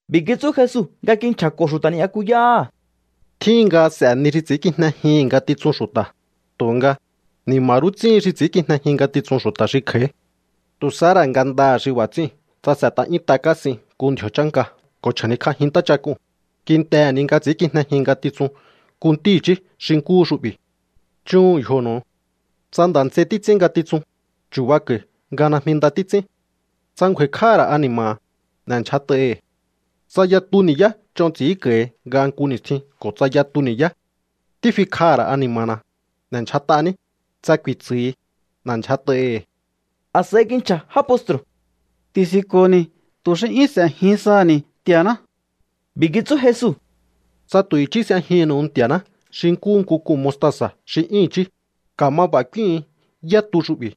B'i̱ kitsú Jesu nga kinchja̱ko̱ xu̱ta̱ ni'yakuyáha̱: —Tjíhin nga s'e̱ ni xi ts'i̱ínkijnejihi̱n ngatitsun xu̱ta̱, tu̱nga, ¡ni̱ma̱ rú ts'íhin xi ts'i̱ínkijnejin ngatitsun xu̱ta̱ xi kj'a̱í! Tu̱ sahá ra̱ ngandaha̱ xi b'a̱ ts'i̱íu̱n tsa s'e̱t'a 'yúnt'a kásin nku ndji̱o̱ chánka ko̱ chja̱nikj'ajin ntáchak'uu̱n, kintehe̱ ni nga ts'i̱ínkijnejin ngatitsun nku ntí i̱chí xi nkúhu xu'bi̱. Chúhu̱un yjonu̱u. ’Tsa nda̱ nts'ei títs'ín ngatitsun, chu̱bako̱i̱ nga najmi nda títs'ín. Tsa ngju̱a̱i̱kj'áha̱ ra̱ ani̱ma̱ha̱, n'e̱ndyjat'aihi̱. Tsa yatu ni̱yá ch'on ts'i̱ínko̱hi nga nku ni̱stjin ko̱ tsa yatu ni̱yá: “Tífikj'aha̱ ra̱ ani̱ma̱na, n'e̱ndyjat'aní”, tsa ku̱i̱tsu̱hi, n'e̱ndyjat'aihi̱. A̱s'a̱i kinchja̱ já postru̱: —Ti̱si̱nko̱ni̱ tu̱ xi 'yún s'e̱jin saha̱ni̱ Nti̱a̱ná. B'i̱ kitsú Jesu: —Tsa tu̱ i̱chí s'ejinnu̱u Nti̱a̱ná xi nkúhu nku k'un mostasa̱ xi 'yún i̱chí, ka̱ma b'a̱ k'úíhu̱un yá tu xu'bi̱: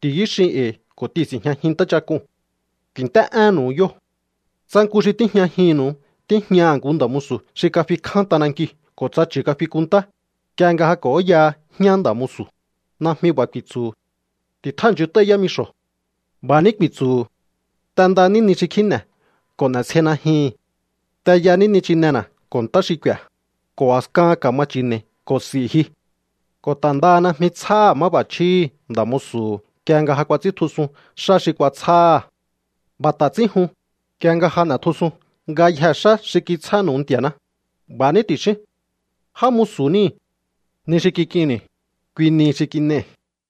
“Ti̱yú xin e̱i̱ ko̱ t'ihi̱nsi̱njñajin ntáchak'uu̱n.” Ku̱i̱nt'é'énnu̱u yóo̱. ’Tsa nku xi tíjñajinnu̱u tíjñaha̱ nku nda̱ musu̱ xi kafikján t'anankiu̱ ko̱ tsa chu̱ kafikunntá, nk'ie nga ja k'o̱óyaha jñá nda̱ musu̱, najmi b'a̱ ku̱i̱tsu̱hu̱: “Ti̱tjáha̱nchunt'áí yámixo̱.” B'a̱ ní ku̱i̱tsu̱hu̱: “T'endaní ni xi kjíne̱ ko̱ n'e̱sjei najyihi̱n. T'eyání nichinena̱ ko̱ ntá xi k'u̱i̱a̱, ko̱ a̱skahan ka̱ma chi̱ne̱i̱ ko̱ s'i̱ ji.” Ko̱ ta̱ ndaha najmi tsjáha̱ máb'a̱chjíhi̱ nda̱ musu̱hu̱ nk'ie nga ja kuats'íntjusun xá xi kuatsjáha̱. B'a̱ ta̱ ts'ín jun, nk'ie nga ja n'e̱tjusun ngayjee̱ xá xi kitsjánu̱u Nti̱a̱ná, b'a̱ ní ti̱xíún: “Já musu̱ níi̱. Ni xi kik'inni̱, kui nihi xi kin'ei̱.”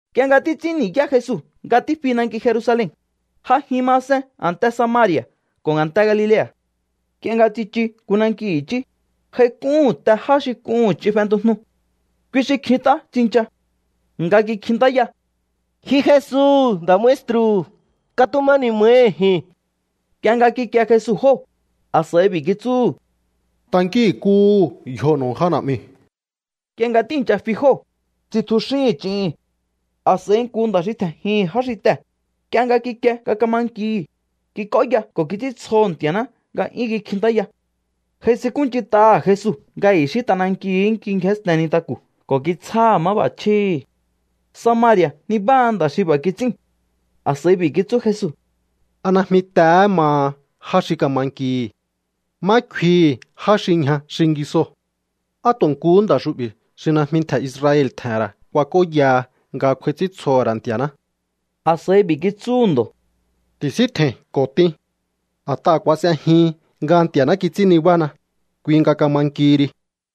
Nk'ie nga títs'ín ni̱yá Jesu nga tífi nanki Jerusalen, j'ajin masen a̱nte Samari̱a̱ ko̱ a̱nte Galilea̱. Nk'ie nga tsichu nku nanki i̱chí, j'aik'úhu̱n te já xi k'uhu̱n ch'in fentujnu. Kui xi kjint'á tsincha nga kikjintáya: —Ji Jesu, nda̱ maestru̱, katuma ni̱ma̱hi ji̱n. Nk'ie nga kikie Jesu jóo̱, a̱s'a̱i b'i̱ kitsúhu̱: —Tankínkuhu̱u yjonu̱u já na̱'miu̱. Nk'ie nga tíi̱ncha fi jóo̱, tsitjuxín ch'ihin. A̱s'a̱i nku nda̱ xi tje̱njihi̱n já xi tee̱, nk'ie nga kikie nga kama nkihi̱, kik'óya ko̱ kits'íntsjoho̱ Nti̱a̱ná nga 'yún kikjintáya. J'aisinkúnch'int'aha̱ Jesu nga i̱xí t'anankiu̱hú kingjénsten nintaku̱ ko̱ kitsjáha̱ máb'a̱chjíhi̱. Samari̱a̱ nibáha nda̱ xi b'a̱ kits'íu̱n. A̱s'a̱i b'i̱ kitsú Jesu: —¿A najmi tehé maha já xi kama nkihi̱? ¿Má kfihi̱ já xi ñja xingisoo̱? ¿Á tu̱ nkuhú nda̱ xu'bi̱ xi najmi ntje̱ Israel tje̱he̱n ra̱ kuak'óyaha nga kj'u̱a̱i̱ts'íntsjoho̱ ra̱ Nti̱a̱ná? A̱s'a̱i b'i̱ kitsúhu̱ ndo̱: —Ti̱síntje̱i̱n ko̱ t'in. A̱t'aha̱ kuas'ejihin nga Nti̱a̱ná kits'ín nibána, kui nga kama nkihi ri.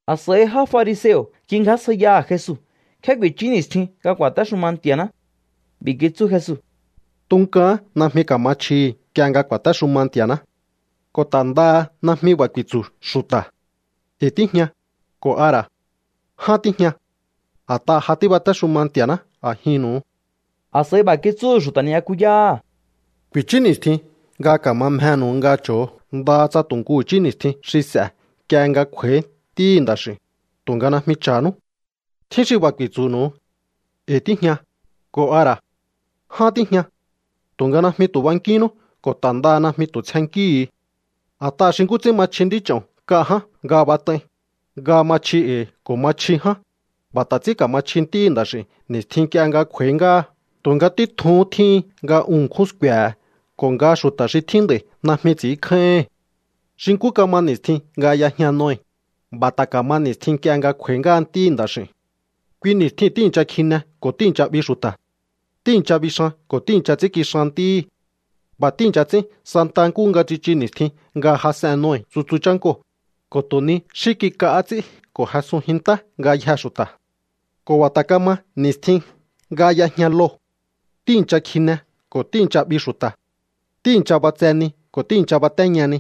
A̱s'a̱i já fariseo̱ kingjásjaiyaha̱ Jesu nkjé ku̱i̱chú ni̱stjin nga ku̱a̱téxuma Nti̱a̱ná. B'i̱ kitsú Jesu: —Tunkaán najmi ka̱ma chjihi̱ nk'ie nga ku̱a̱téxuma Nti̱a̱ná. Ko̱ ta̱ ndaha najmi b'a̱ ku̱i̱tsu̱ xu̱ta̱: “E̱i̱ tíjña”, ko̱ a ra̱: “Ján tíjña.” A̱t'aha̱ ja tíbatéxuma Nti̱a̱ná a̱jinnu̱u. A̱s'a̱i b'a̱ kitsúhu̱ xu̱ta̱ ni'yakuyáha̱: —Ku̱i̱chú ni̱stjin nga ka̱ma mjenu̱u nga cho̱o ndaha tsa tu̱ nku i̱chí ni̱stjin xi s'e̱ nk'ie nga kj'u̱a̱í Ntíhi̱ Nda̱x'i̱u̱n, tu̱nga najmi cha̱nú. Tjín xi b'a̱ ku̱i̱tsu̱nu̱u: “E̱i̱ tíjña”, ko̱ a ra̱: “Ján tíjña.” Tu̱nga najmi tu̱ bankínnú ko̱ ta̱ ndaha najmi tu̱ tsjennkíhu̱u. A̱t'aha̱ xi nkú ts'ín ma chji nd'ích'o̱n nk'a ján nga bat'ai, nga ma chji e̱i̱ ko̱ ma chji ján, b'a̱ ta̱ ts'ín ka̱ma chji Ntíhi̱ Nda̱x'i̱u̱n ni̱stjin nk'ie nga kj'u̱a̱í ngáha. Tu̱nga títjuhún tjíhin nga un ṉkjún sku̱e̱he̱ ko̱ nga xu̱ta̱ xi tjín nd'a̱i̱ najmi ts'i̱ínkjáíhi̱n. ’Xi nkú kama ni̱stjin nga y'ejña Noe, b'a̱ ta̱ ka̱ma ni̱stjin nk'ie nga kj'u̱a̱í ngáha Ntíhi̱ Nda̱x'i̱u̱n. Kui ni̱stjiu̱n tíi̱ncha kjine ko̱ tíi̱ncha 'bi xu̱ta̱. Tíi̱ncha bixan ko̱ tíi̱ncha ts'ínkixan ntíhí. B'a̱ tíi̱ncha ts'ín santa nkúhu nga tsichu ni̱stjin nga jas'en Noe tsutsu chánkoo̱, ko̱ tu̱ ni xí kik'ahá ts'í ko̱ jesunjin ntá ngayjee̱ xu̱ta̱. Ko̱ b'a̱ ta̱ kama ni̱stjin nga y'ejña Lot. Tíi̱ncha kjine ko̱ tíi̱ncha 'bi xu̱ta̱. Tíi̱ncha b'atse ni ko̱ tíi̱ncha batéña ni.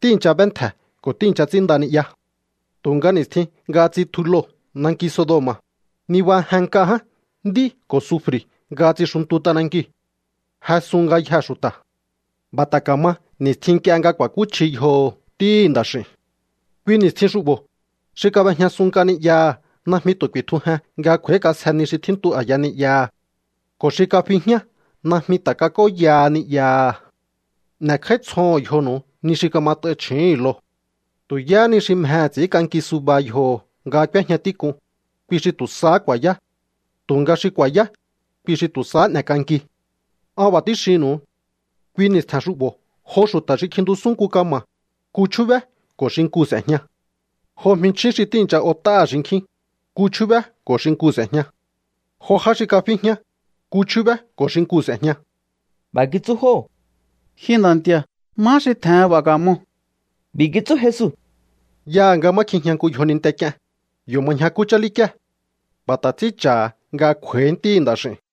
Tíi̱ncha b'éntje̱ ko̱ tíi̱ncha ts'ínnda ni'ya. Tu̱nga ni̱stjin nga tsitju Lot nanki Sodoma̱, nibajen nk'a ján nd'í ko̱ sufri̱ nga tsixuntu t'anankiu̱. Jesun ngayjee̱ xu̱ta̱. B'a̱ ta̱ ka̱ma ni̱stjin nk'ie nga ku̱a̱kúchji yjoho̱ Ntíhi̱ Nda̱x'i̱u̱n. ’Kui ni̱stjin xu'bo̱, xi kab'ejñasun nk'a ni'yaha̱ najmi tu̱ ku̱i̱tjujen nga kj'u̱a̱ík'asje ni xi tjíntu a̱ya ni'yaha̱. Ko̱ xi kafi jñá najmi ta̱ kats'óyaha ni'yaha̱. N'e̱kj'áítsjoho̱on yjonu̱u ni xi kamat'ain chju̱úhu̱n Lot. Tu̱ yáhá ni xi mjehe̱ ts'i̱ínk'anki suba yjoho̱ nga k'úéjña tík'un, kui xi tu̱ sahá ku̱a̱yá. Tu̱nga xi ku̱a̱yá, kui xi tu̱ sahá n'e̱k'anki. An b'a̱ tíxinnu̱u. Kui ni̱stje̱n xu'bo̱ jo xu̱ta̱ xi kjintusún nku kama̱, nku chjúbé ko̱ xinkuu̱ s'e̱jña. Jo jminchjín xi tíi̱ncha ot'áha̱ xinkjín, nku chjúbé ko̱ xinkuu̱ s'e̱jña. Jo já xi kafi jñá, nku chjúbé ko̱ xinkuu̱ s'e̱jña. B'a̱ kitsú jóo̱: —Ji Nda̱ Nti̱a̱, ¿má xi tje̱hen b'a̱ ka̱moo̱? B'i̱ kitsú Jesu: —Yaha̱ nga má kjijña nku yjoninte k'ien, yo̱ ma ñjakú chálíkíe̱. B'a̱ ta̱ ts'ín cha̱ha̱ nga kj'u̱a̱í Ntíhi̱ Nda̱x'i̱u̱n.